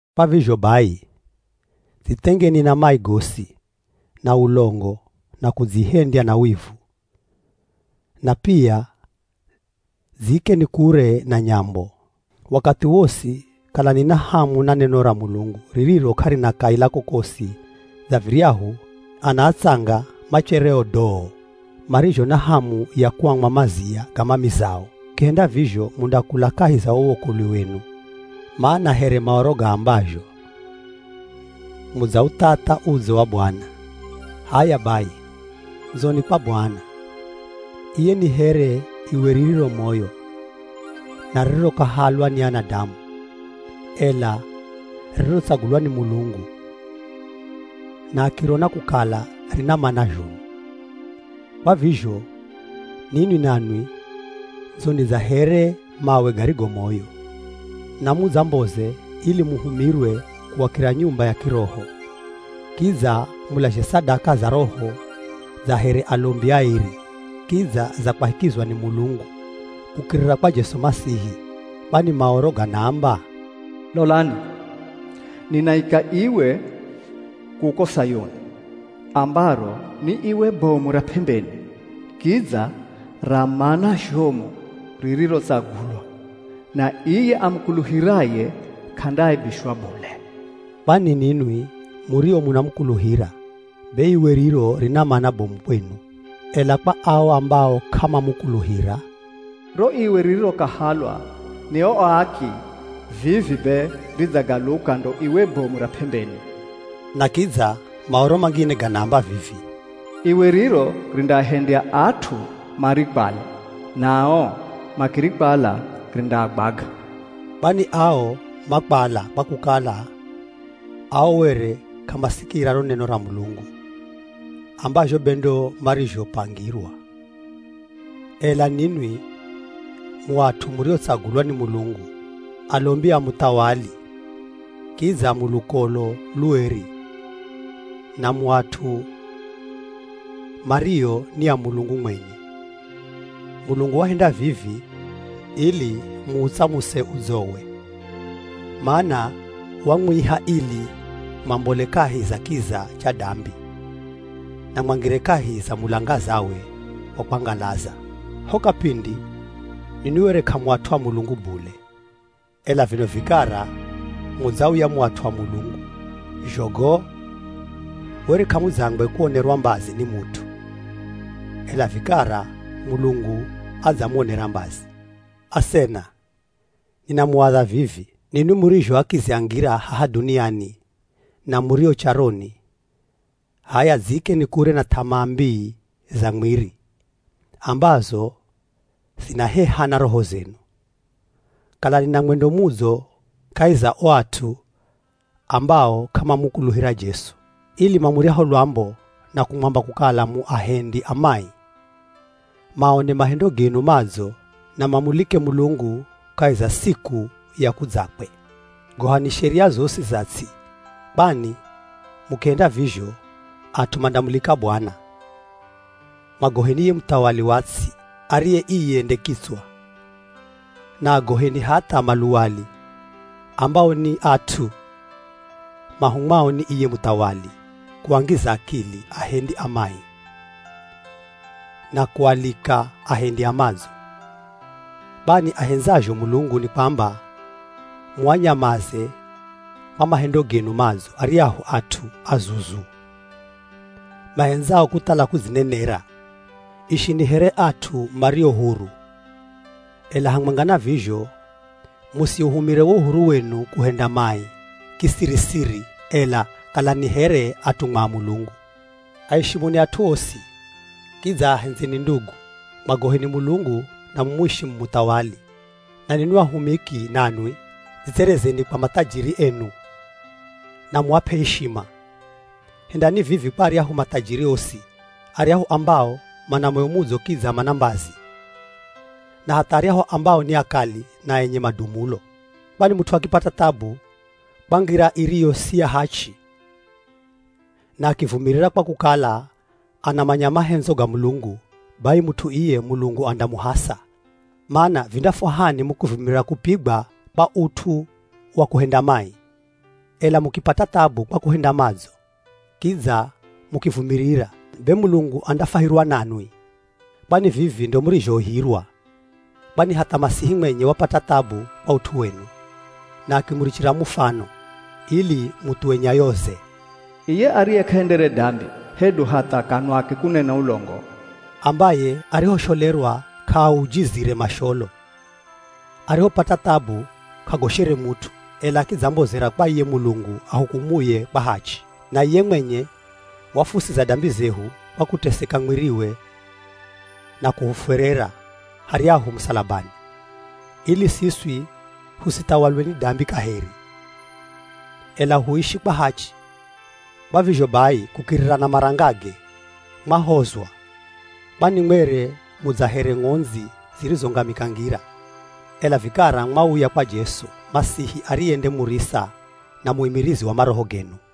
Kwa vizho bai, dzithengeni na mai gosi, na ulongo, na kudzihendya na wivu, na pia dziikeni kure na nyambo. Wakathi wosi kalani na hamu na neno ra Mulungu ririro k'arina kaila kokosi dza viryahu ana atsanga machereo doo marizho na hamu ya kuamwa mazia ga mamizao. Mukihenda vizho mundakula kahi za wo wokolwi wenu. Mana here Maoro gaambazho, “Mudzauthatha udzo wa Bwana.” H'aya bai ndzoni kwa Bwana, iye ni here iwe ririro moyo na ririrokahalwa ni anadamu, ela ririrotsagulwa ni Mulungu na akirona kukala rina mana zhomu. Kwa vizho ninwi nanwi ndzoni dza here mawe garigo moyo, na mudzamboze ili muhumirwe kuakira nyumba ya kiroho. Kidza mulazhe sadaka za roho dza here alombi aeri, kidza za kwahikizwa ni Mulungu, kukirira kwa Jesu Masihi. Kwani Maoro ganaamba, “Lolani, ninaika iwe kuko Sayuni, ambaro ni iwe bomu ra p'embeni, kidza ra mana zhomu ririrotsagulwa. Na iye amukuluhiraye k'andaaibishwa bule.” Kwani ninwi murio munamukuluhira, be iwe riro rina mana bomu kwenu. Ela kwa ao ambao k'amamukuluhira, “Ro iwe ririrokahalwa ni o aaki vivi be ridzagaluka ndo iwe bomu ra p'embeni.” Na kidza Maoro mangine ganaamba vivi, “Iwe riro rindaahendya at'u marikwale, nao makirikwala rindaagwaga.” Kwani ao makwala kwa kukala ao were k'amasikira ro neno ra Mulungu ambazho be ndo marizhopangirwa. Ela ninwi mu at'u muriotsagulwa ni Mulungu, alombi a Muthawali, kidza mu lukolo lueri, na mu at'u mario ni a Mulungu mwenye. Mulungu wahenda vivi ili muutsamuse udzowe, mana wamwiha ili mwambole kahi za kiza cha dambi na mwangire kahi za mulangazawe wa kwangalaza. Ho kapindi ninwi were k'amu at'u a Mulungu bule, ela vino vikara mudzauya mu at'u a Mulungu. Zhogo, were k'amudzangwe kuonerwa mbazi ni mut'u, ela vikara Mulungu adzamuonera mbazi. Asena, ninamuadha vivi: Ninwi murizho akizi a ngira haha dhuniani, na murio charoni, h'aya dziikeni kure na th'amaa mbii za mwiri ambazo zinaheha na roho zenu. Kalani na mwendo mudzo kahi za o at'u ambao k'amamukuluhira Jesu, ili mamuryaho lwambo na kumwamba kukala mu ahendi a mai, maone mahendo genu madzo na mamulike Mulungu kahi za siku ya kudzakwe. Gohani sheria zosi za ts'i, kwani mukihenda vizho at'u mandamulika Bwana. Mwagoheni ye muthawali wa ts'i ariye iye nde kitswa, na agoheni hatha maluwali, ambao ni at'u mahumwao ni iye muthawali kuangiza akili ahendi a mai na kualika ahendi a madzo. Kwani ahendzazho Mulungu ni kwamba muanyamaze kwa mahendo genu madzo aryahu at'u azuzu mahendzao kuthala kudzinenera. Ishini here at'u mario huru, ela hamwenga na vizho musiuhumire wo uhuru wenu kuhenda mai kisiri-siri, ela kalani here atumwa a Mulungu. Aishimuni at'u osi, kidza ahendzeni ndugu. Mwagoheni Mulungu na mumwishimu muthawali. Na ninwi ahumiki nanwi dzitserezeni kwa mathajiri enu na muap'e ishima. Hendani vivi kwa aryahu mathajiri osi, aryahu ambao mana moyo mudzo kidza mana mbazi, na hatha aryahu ambao ni akali na enye madumulo. Kwani mut'u akipata thabu kwa ngira iriyo si ya hachi na akivumirira kwa kukala anamanya mahendzo ga Mulungu, bai mut'u iye Mulungu andamuhasa. Mana, vindafwahani mukivumirira kupigwa kwa ut'u wa kuhenda mai? Ela mukipata thabu kwa kuhenda madzo, kidza mukivumirira, be Mulungu andafwahirwa nanwi. Kwani vivi ndo murizhoihirwa, kwani hatha Masihi mwenye wapata thabu kwa ut'u wenu, na akimurichira mufano, ili muthuwe nyayoze. Iye ariye k'ahendere dambi, hedu hatha kanwake kunena ulongo, ambaye arihosholerwa k'aaujizire masholo, arihopata thabu k'agoshere mut'u, ela akidzambozera kwa iye Mulungu ahukumuye kwa hachi. Na iye mwenye wafuusiza dambi zehu kwa kuteseka mwiriwe na kuhufwerera haryahu musalabani, ili siswi husithawalwe ni dambi kaheri, ela huishi kwa hachi. Kwa vizho bai kukirira na marangage, mwahozwa. Kwani mwere mu dza here ng'ondzi zirizongamika ngira, ela vikara mwauya kwa Jesu Masihi ariye nde murisa na muimirizi wa maroho genu.